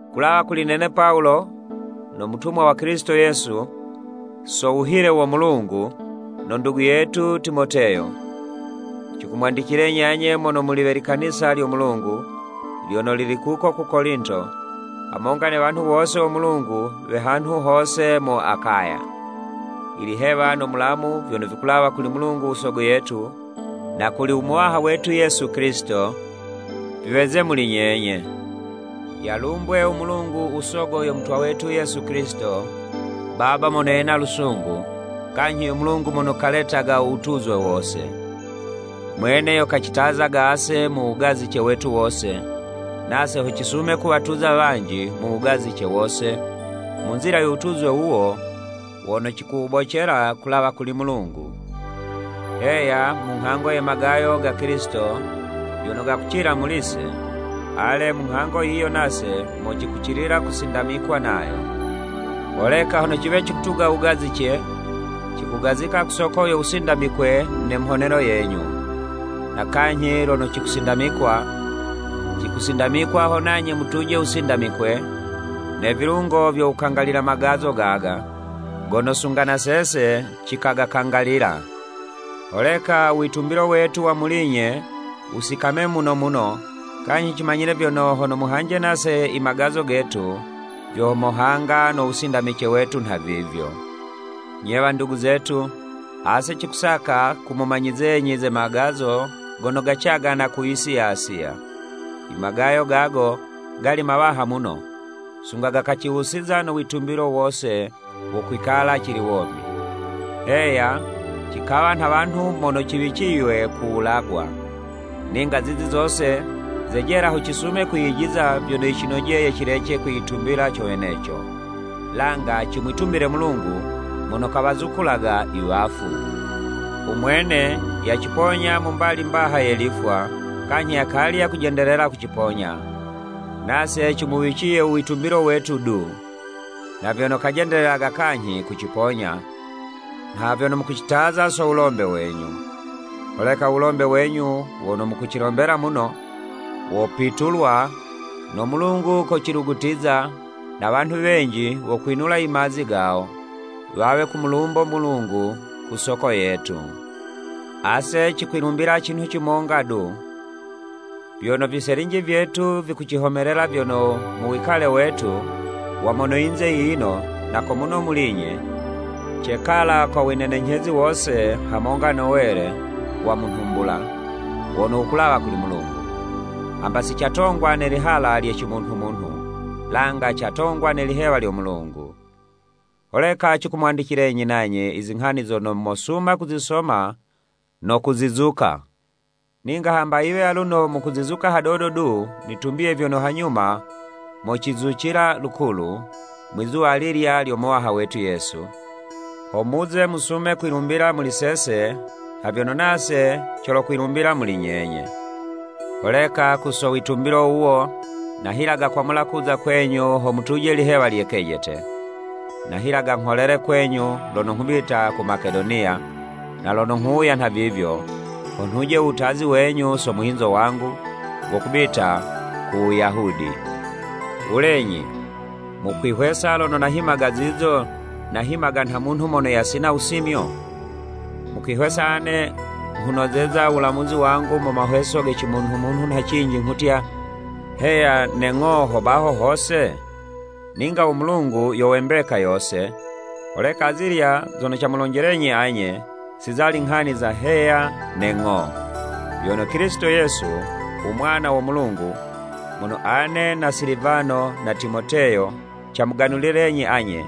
Kulawa kuli nene Pawulo, no mutumwa wa Kilisito Yesu, so wuhile wo Mulungu, no ndugu yetu Timoteyo. Cikumwandicilenyi anye mono muli we likanisa lyo Mulungu, lyono lili kuko ku Kolinto, hamonga ne wanhu wose wo Mulungu we hanhu hose mu Akaya. Ilihewa no mulamu vyono vikulawa kuli Mulungu u Sogo yetu, na kuli u Muwaha wetu Yesu Kilisito, viweze muli nyenye. Yalumbwe u Mulungu u Sogo yo Mutwa wetu Yesu Kilisito, Baba mono yena lusungu, kanyhi yo Mulungu mono kaletaga u wutuzwe wose. Mwene yo kacitazaga ase mu wugazice wetu wose, nase ho cisume kuwatuza wanji mu wugazice wose, mu nzila yo wutuzwe wuwo wono cikulubocela kulawa kuli Mulungu. Heya, mu nghango ye magayo ga Kilisito vyono gakucila muli'se, ale, mu nghango yiyo nase mo cikucilila kusindamikwa nayo. Holeka hono ciwe cikutuga wugazice, cikugazika ku soko yo wusindamikwe ne mhonelo yenyu. Na kanyhi lono cikusindamikwa, cikusindamikwa ho nanye mutuje wusindamikwe, ne vilungo vyo wukangalila magazo gaga, gono sunga na sese cikagakangalila. Holeka uwitumbilo wetu wa muli'nye, wusikame muno muno, kanyhi cimanyile vyono, hono muhanje nase i magazo getu, vyo mohanga no wusindamice wetu nhavivyo. Nye nyo wandugu zetu, ase cikusaka kumumanyizenyi, ze magazo gono gacagana ku yisi ya Asiya, i magayo gago gali mawaha muno, sunga gakaciwusiza no witumbilo wose wo kwikala cili womi. Heya, cikawa nha wanhu mono ciwiciywe kuwulagwa. Ninga zizi zose, zejela ho cisume kwiyijiza vyono yicinojeye cilece kwiyitumbila co weneco, langa cimwitumbile Mulungu, mono kawazukulaga i wafu. U Mwene yaciponya mu mbali mbaha ye lifwa, kanyhi yakali yakujendelela kuciponya, nase cimuwiciye u witumbilo wetu du, nha vyono kajendelelaga kanyhi kuciponya, nha vyono mukucitaza so wulombe wenyu. Holeka u wulombe wenyu wono mukucilombela muno, wopitulwa, no Mulungu kocilugutiza, na wanhu wenji wokwinula i mazi gawo, wawe kumulumbo Mulungu ku soko yetu. Ase cikwilumbila cinhu cimonga du, vyono viselinji vyetu vikucihomelela vyono, mu wikale wetu wa mono yinze yiyino na ko muno muli'nye, cekala ko winenenyhezi wose hamonga no wele wa mu nhumbula, wono wukulawa kuli Mulungu, hamba si catongwa ne lihala lye cimunhu-munhu, langa catongwa ne lihewa lyo Mulungu. Holeka cikumwandicilenyi nanye izinghani zono mosuma kuzisoma no kuzizuka. Ninga hamba yiwe aluno mukucizuka hadodo du, nitumbiye vyono hanyuma mocizucila lukulu, Mwizuwa alilya lyo Muwaha wetu Yesu, ho muze musume kwilumbila muli sese, nha vyono nase colokwilumbila muli nyenye. Holeka ku so witumbilo wuwo, nahilaga kwamula kuza kwenyu ho mutuje lihewa lye kejete. Nahilaga ngholele kwenyu lono nghubita ku Makedoniya, na lono nghuwuya nhavivyo, ho nhuje u wutazi wenyu so muhinzo wangu wo kubita ku Wuyahudi. Wulenyi! Mukwihwesa lono nahimaga zizo, nahimaga nha munhu mono yasina wusimyo? Mukwihwesa ane nghunozeza u wulamuzi wangu mu mahweso ge cimunhumunhu nha cinji nghutya “Heya” ne “Ng'o” ho baho hose? Ninga u Mulungu yo we mbeka yose, holeka azilya zono camulonjelenyi anye, si zali nghani za “Heya” ne “Ng'o.” Vyono Kilisito Yesu, u Mwana wo Mulungu, mono ane na Silivano na Timoteyo camuganulilenyi anye,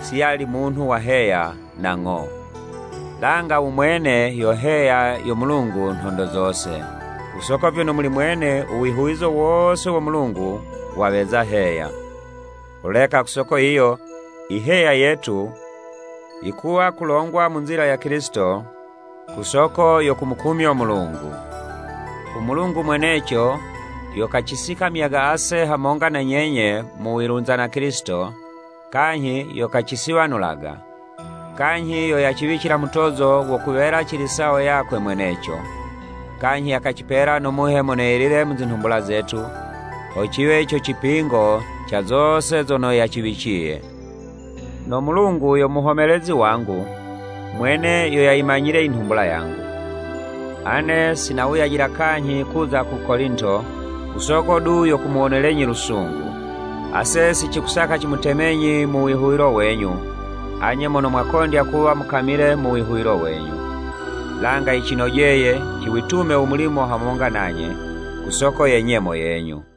si yali munhu wa “Heya” na “Ng'o,” langa u mwene yo “Heya” yo Mulungu nhondo zose. Ku soko vyono muli mwene u wihuwizo wose wo Mulungu waweza “Heya.” Holeka ku soko yiyo, i “Heya” yetu yikuwa kulongwa mu nzila ya Kilisito, ku soko yo kumukumyo Mulungu. U Mulungu mweneco yo kacisikamyaga ase hamonga na nyenye mu wilunza na Kilisito, kanyhi yo kacisiwanulaga, kanyhi yo yaciwicila mutozo wo kuwela cili sawo yakwe mweneco, kanyhi yakacipela no Muhe Mono Yelile mu zinhumbula zetu, ho ciwe co cipingo ca zose zono yaciwiciye. No Mulungu yo muhomelezi wangu, mwene yo yayimanyile i nhumbula yangu! Ane, sinawuyajila kanyhi kuza ku Kolinto, ku soko du yo kumuwonelenyi lusungu. Ase si cikusaka cimutemenyi mu wihuwilo wenyu, anye mono mwakondya kuwa mukamile mu wihuwilo wenyu. Langa yicinojeye, ciwitume u mulimo hamonga nanye, ku soko ye nyemo yenyu.